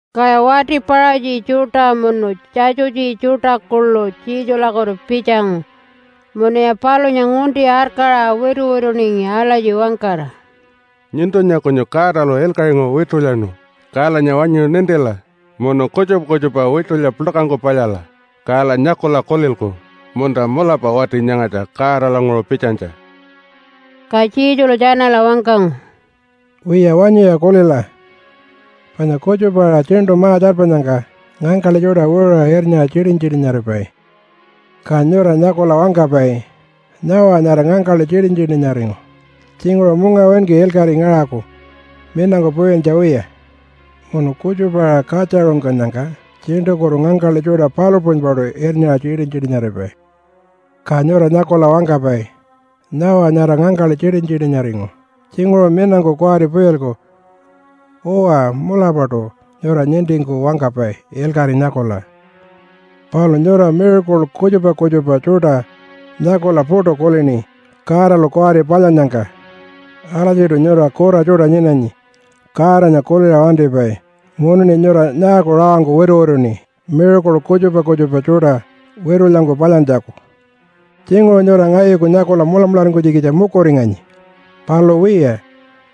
Kaya wati Paṟatji tjuṯa munu Tjatjutji tjuṯa kuḻu Jesulakutu pitjangu munuya palunya ngunti arkaṟa wituwituningi alatji wangkara, “Nyuntunya kunyu Godalu ilkaṟinguṟu witulyanu. Kalanya wanyu nintila munu kutjupa kutjupa witulya puḻkangku palyala, kala nyakula kulilku, ‘Munta mulapa wati nyangatja Godalanguṟu pitjanytja.’” Ka Jesulu tjanala wangkangu, “Wiya, wanyuya kulila! Panya kutjupa-aṟa tjiṉṯu ma-tjarpanyangka ngangkaḻi tjuṯa wiṟuṟa irnyaṟa tjitin-tjitinaripai, ka nyura nyakula wangkapai, ‘Nyawa nyara ngangkaḻi tjitin-tjitinaringu. Tjinguṟu mungawinki ilkaṟi ngaṟaku minangku puyintja wiya.’ Munu kutjupa-aṟa katjaṟungkannyangka tjiṉṯukutu ngangkaḻi tjuṯa palu puṟunypaṯu irnyaṟa tjitin-tjitinaripai, ka nyura nyakula wangkapai, ‘Nyawa nyara ngangkaḻi tjitin-tjitinaringu. Tjinguṟu minangku kuwari puyilku.’ Uwa, mulapaṯu nyura nintingku wangkapai ilkaṟi nyakula. Palu nyura miracle kutjupa kutjupa tjuṯa nyakula puṯu kulini Godalu kuwari palyannyangka. Alatjiṯu nyura kura tjuṯa nyinanyi, Godanya kuliṟa wantipai. Munuṉi nyura nyaaku rawangku wituwituṉi miracle kutjupa kutjupa tjuṯa witulyangku palyantjaku? Tjinguṟu nyura ngayuku nyakula mulamularingkunytjikitja mukuringanyi. Palu wiya,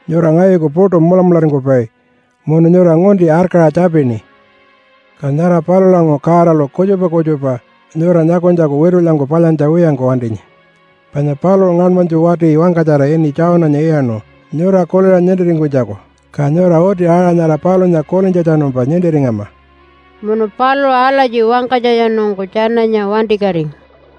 nyura ngayuku puṯu mulamularingkupai munu nyura ngunti arkaṟa tjapini. Ka nyara palulanguṟu Godalu kutjupa kutjupa nyura nyakunytjaku witulyangku palyantja wiyangku wantinyi, panya paluṟu ngaṉmanytju wati wangkatjara ini Jonah-nya iyaṉu nyura kuliṟa nintiringkunytjaku, ka nyura uti aṟa nyara palunya kulintjatjanumpa nintiringama.” Munu paluṟu alatji wangkanytjatjanungku tjananya wantikatingu.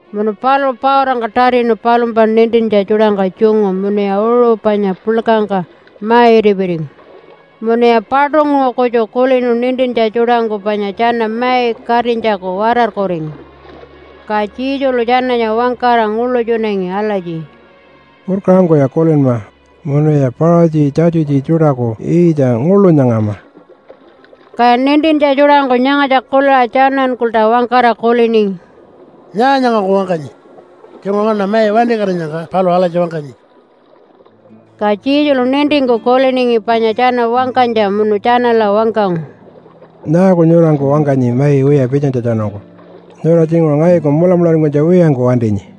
Munu paluṟu pautangka tatinu palumpa nintintja tjuṯangka tjungu munuya uṟu panya puḻkangka ma-itipiringi. Munuya paṯunguṟu kutju kulinu nintintja tjuṯangku panya tjana mai katinytjaku watarkuringu. Ka Jesulu tjananya wangkara nguḻutjunangi alatji, “Purkaṟangkuya kulinma munuya Paṟatji, Tjatjutji tjuṯaku yiitja nguḻu nyangama.” Kaya nintintja tjuṯangku nyangatja kuliṟa tjanankulta wangkara kuliningi, “Nyaa nyangangku wangkanyi? Tjinguṟu nganaṉa mai wantikatinyangka paluṟu alatji wangkanyi.” Ka Jesulu nintingku kuliningi panya tjana wangkanytja munu tjanala wangkangu, “Nyaaku nyuranku wangkanyi mai wiya pitjanytjatjanungku? Nyura tjinguṟu ngayuku mulamularingkunytja wiyangku wantinyi.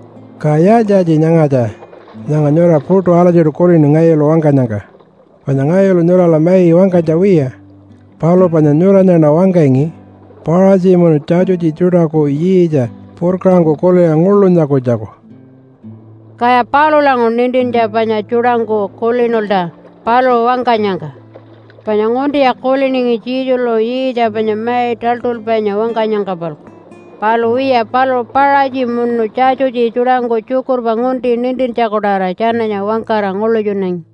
Ka yaaltji-yaaltji nyangatja nyanga nyura puṯu alatjiṯu kulini ngayulu wangkanyangka? Panya ngayulu nyurala mai wangkanytja wiya, palu panya nyuranyaṉa wangkangi Paṟatji munu Tjatjutji tjuṯaku yiitja purkaṟangku kuliṟa nguḻu nyakunytjaku.” Kaya palulanguṟu nintintja panya tjuṯangku kulinulta paluṟu wangkanyangka, panya nguntiya kuliningi Jesulu yiitja panya mai taḻṯulpainya wangkanyangka-palku. Palu wiya, paluṟu Paṟatji munu Tjatjutji tjuṯangku tjukurpa ngunti nintintjaku-tawara tjananya wangkara nguḻutjunangi.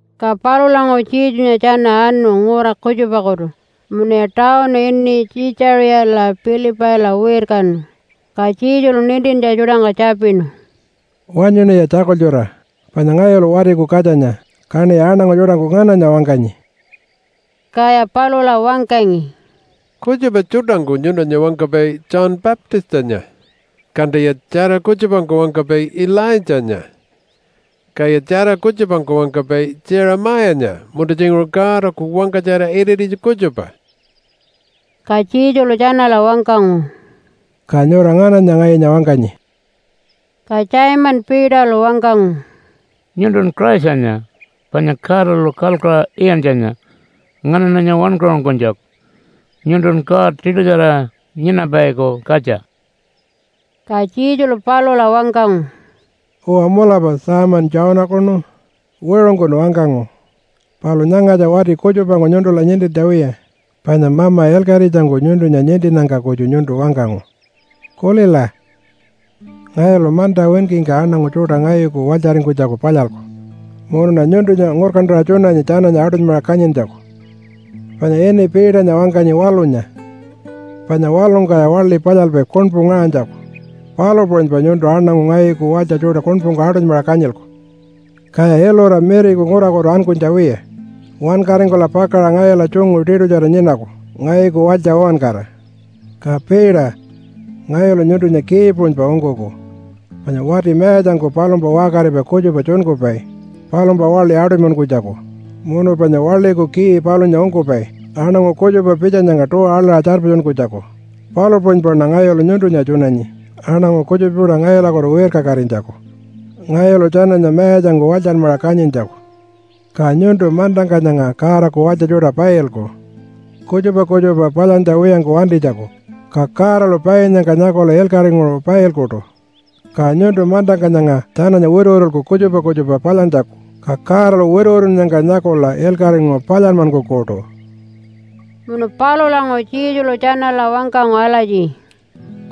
Ka palulanguṟu Jesunya tjana anu ngura kutjupakutu munuya tawunu ini Tjiitjaṟiya-Pilipaila wirkanu, ka Jesulu nintintja tjuṯangka tjapinu, “Wanyuṉiya tjakultjura! Panya ngayulu Watiku Katjanya, kaṉiya aṉangu tjuṯangku ngananya wangkanyi?” Kaya palula wangkangi, “Kutjupa tjuṯangku nyuntunya wangkapai ‘John Baptistanya’, kantaya tjara kutjupangku wangkapai ‘Ilaitjanya’, kaya tjara kutjupangku wangkapai ‘Jeremiah-nya’, munta tjinguṟu Godaku wangkatjara irititja kutjupa.” Ka Jesulu tjanala wangkangu, “Ka nyura ngananya ngayunya wangkanyi?” Ka Simon Peterlu wangkangu, “Nyuntun Christanya, panya Godalu kalkuṟa iyantjanya nganaṉanya wankaṟunkunytjaku. Nyuntun God tiṯutjara nyinapaiku katja.” Ka Jesulu palula wangkangu, “Uwa mulapa Simon Jonah-kunu! Wiṟungkun wangkangu. Palu nyangatja wati kutjupangku nyuntula nintintja wiya, panya Mama ilkaṟitjangku nyuntunya nintinnyangka kutju nyuntu wangkangu. Kulila! Ngayulu manta winkingka aṉangu tjuṯa ngayuku walytjaringkunytjaku palyalku, munuṉa nyuntunya ngurkantaṟa tjunanyi tjananya aṯunymaṟa kanyintjaku. Panya ini Peternya wangkanyi ‘Waḻunya.’ Panya waḻungkaya waḻi palyalpai kuṉpu ngaṟanytjaku, palu puṟunypa nyuntu aṉangu ngayuku walytja tjuṯa kuṉpungku aṯunymaṟa kanyilku, kaya ilura miriku ngurakutu ankunytja wiya wankaringkula pakaṟa ngayula tjungu tiṯutjara nyinaku ngayuku walytja uwankara. Ka Peter, ngayulu nyuntunya key puṟunypa ungkuku, panya wati mayatjangku palumpa waṟkaripai kutjupa tjunkupai palumpa waḻi aṯunymankunytjaku munu panya waḻiku key palunya ungkupai aṉangu kutjupa pitjanyangka tuwa aḻaṟa tjarpatjunkunytjaku, palu puṟunypaṉa ngayulu nyuntunya tjunanyi aṉangu kutjupa tjuṯa ngayulakutu wirkakatinytjaku ngayulu tjananya mayatjangku walytjanmaṟa kanyintjaku. Ka nyuntu mantangka nyanga Godaku walytja tjuṯa pailku kutjupa kutjupa palyantja wiyangku wantinytjaku, ka Godalu painnyangka nyakula ilkaṟinguṟu pailkuṯu. Ka nyuntu mantangka nyanga tjananya wituwitulku kutjupa kutjupa palyantjaku, ka Godalu wituwitunnyangka nyakula ilkaṟinguṟu palyanmankukuṯu.” Munu palulanguṟu Jesulu tjanala wangkangu alatji,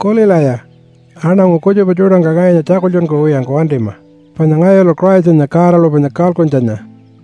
“Kulilaya! Aṉangu kutjupa tjuṯangka ngayunya tjakultjunkuwiyangku wantima, panya ngayulu Christanya Godalu panya kalkuntjanya!”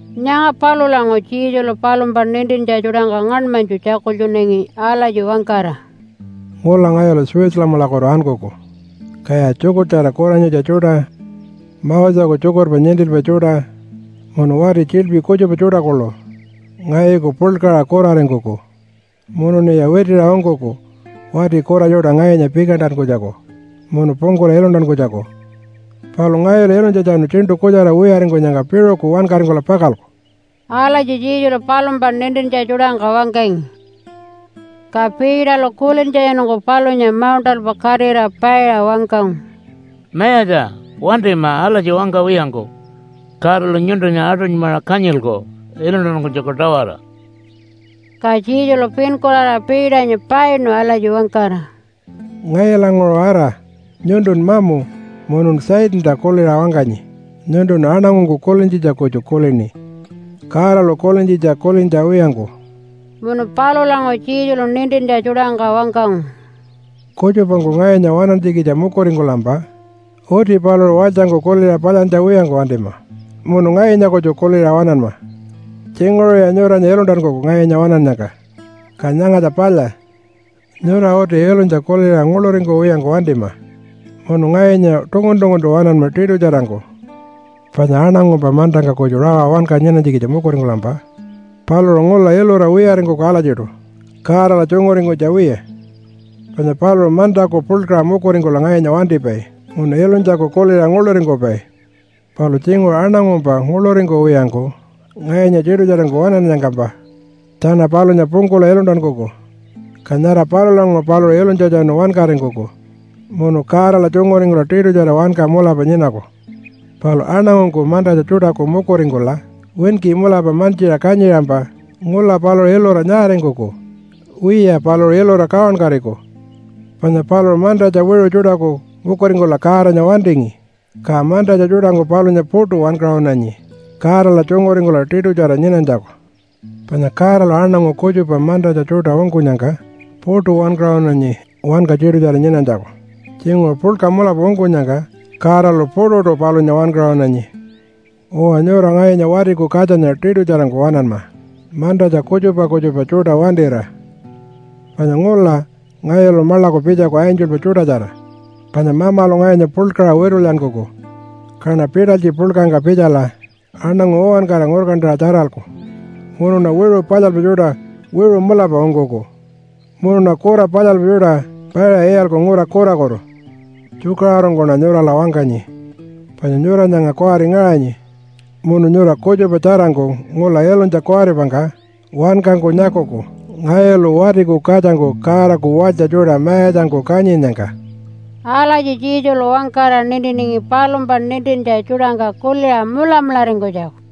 Nyanga palulanguṟu Jesulu palumpa nintintja tjuṯangka ngaṉmanytju tjakultjunangi alatji wangkara, “Ngula ngayulu Jerusalemalakutu ankuku, kaya tjukurtjara kuranyitja tjuṯa, Moseku tjukurpa nintilpai tjuṯa munu wati tjiḻpi kutjupa tjuṯa kuḻu ngayuku puḻkaṟa kuraringkuku munuṉiya witiṟa ungkuku wati kura tjuṯa ngayunya pikantankunytjaku munu pungkula iluntankunytjaku. Palu ngayulu ilunytjatjanu tjiṉṯu kutjara wiyaringkunyangka piṟuku wankaringkula pakalku.” Alatji Jesulu palumpa nintintja tjuṯangka wangkangi. Ka Peterlu kulintjatjanungku palunya mauṉṯalpa katira paiṟa wangkangu, “Mayatja, wantima alatji wangkawiyangku! Godalu nyuntunya aṯunymaṟa kanyilku iluntankunytjaku-tawara.” Ka Jesulu pinkuraraṟa Peternya painu alatji wangkara, “Ngayulanguṟu ara! Nyuntun mamu, munun Satanta kuliṟa wangkanyi. Nyuntun aṉangungku kulintjitja kutju kulini Godalu kulintjitja kulintja wiyangku.” Munu palulanguṟu Jesulu nintintja tjuṯangka wangkangu, “Kutjupangku ngayunya waṉantjikitja mukuringkulampa uti paluṟu walytjangku kuliṟa palyantja wiyangku wantima, munu ngayunya kutju kuliṟa waṉanma. Tjinguṟuya nyuranya iluntankuku ngayunya waṉannyangka, ka nyangatja palya, nyura uti ilunytja kuliṟa nguḻuringkuwiyangku wantima munu ngayunya tungun-tunguntu waṉanma tiṯutjarangku. Panya aṉangumpa mantangka kutju rawa wanka nyinanytjikitja mukuringkulampa paluṟu ngula ilura wiyaringkuku alatjiṯu Godala tjunguringkunytja wiya, panya paluṟu mantaku puḻkaṟa mukuringkula ngayunya wantipai munu ilunytjaku kuliṟa nguḻuringkupai. Palu tjinguṟu aṉangumpa nguḻuringkuwiyangku ngayunya tiṯutjarangku waṉannyangkampa tjana palunya pungkula iluntankuku, ka nyara palulanguṟu paluṟu ilunytjatjanu wankaringkuku munu Godala tjunguringkula tiṯutjara wanka mulapa nyinaku. Palu aṉangungku mantatja tjuṯaku mukuringkula winki mulapa mantjiṟa kanyiṟampa ngula paluṟu ilura nyaaringkuku? Wiya, paluṟu ilura kawankatiku, panya paluṟu mantatja wiṟu tjuṯaku mukuringkula Godanya wantingi, ka mantatja tjuṯangku palunya puṯu wankaṟunanyi Godala tjunguringkula tiṯutjara nyinanytjaku. Panya Godalu aṉangu kutjupa mantatja tjuṯa ungkunyangka puṯu wankaṟunanyi wanka tiṯutjara nyinanytjaku. Tjinguṟu puḻka mulapa ungkunyangka Godalu puṯuṯu palunya wankaṟunanyi. Uwa, nyura ngayunya Watiku Katjanya tiṯutjarangku waṉanma mantatja kutjupa kutjupa tjuṯa wantira, panya ngula ngayulu maḻaku pitjaku angelpa tjuṯatjara. Panya Mamalu ngayunya puḻkaṟa witulyankuku kaṉa pitalytji puḻkangka pitjala aṉangu uwankara ngurkantaṟa tjaralku. Munuṉa wiṟu palyalpai tjuṯa wiṟu mulapa ungkuku munuṉa kura palyalpai tjuṯa paiṟa iyalku ngura kurakutu. Tjukaṟurungkuṉa nyurala wangkanyi, panya nyura nyanga kuwari ngaṟanyi, munu nyura kutjupa tjarangku ngula ilunytja kuwaripangka wankangku nyakuku ngayulu Watiku Katjangku Godaku walytja tjuṯa mayatjangku kanyinnyangka.” Alatji Jesulu wangkara nintiningi palumpa nintintja tjuṯangka kuliṟa mulamularingkunytjaku.